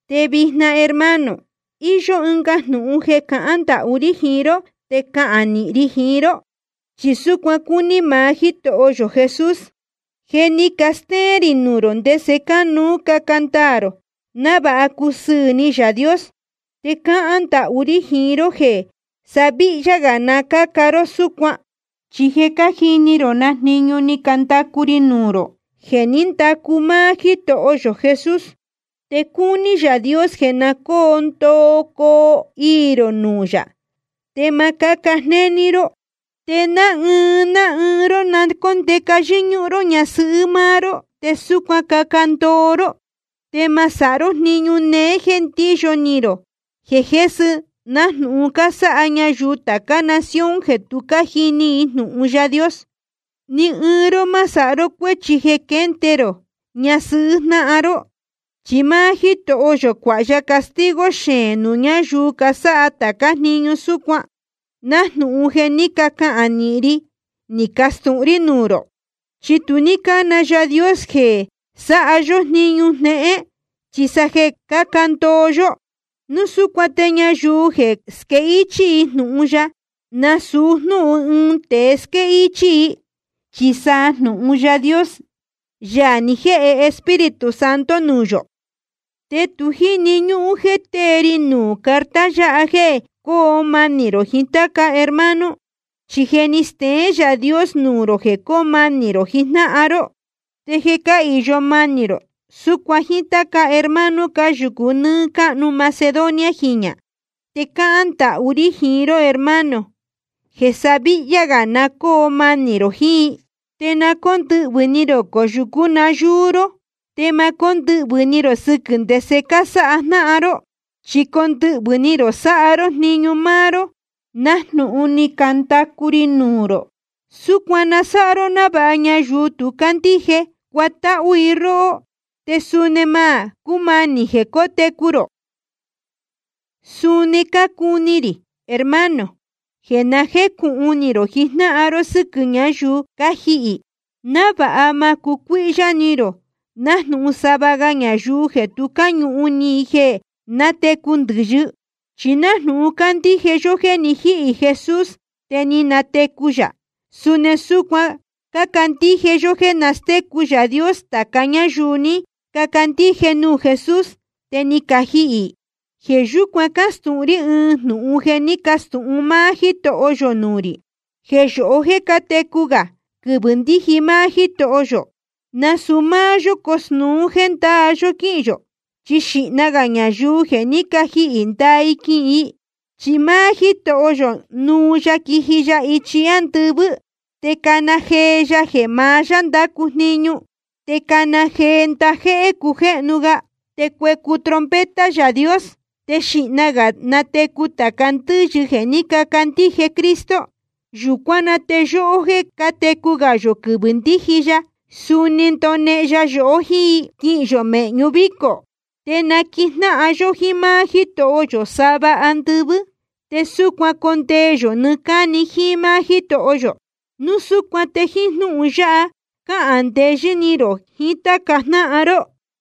Te vijna hermano, íyó ɨnga jnūhun jeē cácahān ndahú rí jiín ró te cáhán nīhin ri jiín ró, chi súcuan cúní maá Jítoho yō Jesús. Je ni castéén rī nuū rō ndese cánuú caca ndaā rō návāha cusɨɨ̄ ni Yaā Dios. Te cácahān ndahú rí jiín ró jeē sa víhyá gā na cáca ró súcuan. Chi je cájini rō na jniñu ni candacu ri nuū rō jeē ní ndacu máá Jítoho yō Jesús. Te cúní Yaā Dios jeē na cóo ndoo coo iī rō nuū yā, te ma cáca jnéní ró. Te ná ɨɨn ná ɨɨn ró na cóndeca yɨ́ñúhún ró ñasɨhɨ́ máá ró, te súcuan caca ndoo ró. Te ma sáha ró jniñu néé jéē ndíyo ni rō jesɨhɨ́, nájnūhun cásáha ñayuu tācá nación jeē tu cájini i jnūhun Yaā Dios. Ni ɨɨn ró ma sáha ró cuéchi jeē quénde rō ñasɨhɨ́ jnáhan ró. Chi máá Jítoho yō cuāha ya castigo xeēn nuū ñáyuu casáha tācá jniñu súcuan, nájnūhun je ni cacahān nīhin ri ni castūhun rí nuū rō. Chi tu ní cána Yaā Dios yohó jéē sáha yó jniñu jnéhén, chi sa jeē caca ndoo yó. Núu súcuan te ñayuu jeē squéhichī jnūhun yáha, nasūu jnúhun ɨɨn tēe squéhichī i, chi sa jnūhun Yaā Dios, Yaā ni jéhe Espíritu Santo nuū yō. Te tu jíni ñúhún jéē tée ri nuū carta yáha jéē coo manī rō jiín táca hermano, chi je ni steén Yaā Dios nuū rō jeē coo manī rō jiín jnáhan ró. Te je cáhīyo manī rō súcuan jíín táca hermano cáyūcu nɨ́ɨ́ cáhnu Macedonia jiñā. Te cáhán ndahú rí jiín ró hermano, jeē sa víhyá gā na cóo manī rō jiín i. Te na cóndɨhvɨ̄ ni rō coyūcú nayúú ró, te ma cóndɨhvɨ̄ ni rō sɨquɨ̄ ndese cásáha jnáhan ró, chi condɨhvɨ̄ ni rō sáha ró jniñu máá ró, nájnūhun ni candacu ri nuū rō. Súcuan na sáha ró návāha ñayuu tu cándíje, cuatáhú i róhó, te suni ma cúmanī jeē cotecu rō. Suni cácuni rī, hermano, jeē na jécūhun ni rō jijnáhan ró sɨ́quɨ̄ ñáyuu cájihī, návāha ma cucuíhyá ni rō nájnūhun sava ga ñayuu jeē tu cáñuhun ni i jeē nátecu ndɨ̄yɨ. Chi nájnūhun cácandíje yó jéē ni jíhī Jesús te ni natecu yā, suni súcuan cácandíje yó jéē nastécu Yaā Dios tāca ñáyuu ni cacandíje nuū Jesús te ni cajihī. Jeē yúcuan cácastūhun rí ɨɨn jnūhun jeē ní castūhun máá Jítoho yō nuū rī: Jeē yóhó jéē cátecu gā quɨvɨ̄ ndíji máá Jítoho yō, nasūu máá yó cosnūu jéē ndaa yó quíhīn yō. Chi xīhna gā ñayuu je ni cajihī ndaa i quihīn i. Chi máá Jítoho yō nuu ya quiji ya ichi ándɨvɨ́, te cana jee ya jeē maá yá ndácu jniñu, te cana jee ndajéhé cujéhnu ga, te cuecu trompeta Yaā Dios. Te xīhna gā natecu tāca ndɨ́yɨ jeē ní cacandíje Cristo. Yūcuán na te yóhó jeē cátecu gā yō quɨvɨ̄ ndíji ya, suni ndonehen ya yohó jíín i, quihīn yō mēhñu vícō. Te naquijnáhan yó jíín máá Jítoho yō sava andɨvɨ́. Te súcuan condee yō nɨɨ́ cáni jíín máá Jítoho yō. Núu súcuan te jíín jnúhun yáha cahān ndeyɨ́ ni rō jiín táca jnáhan ró.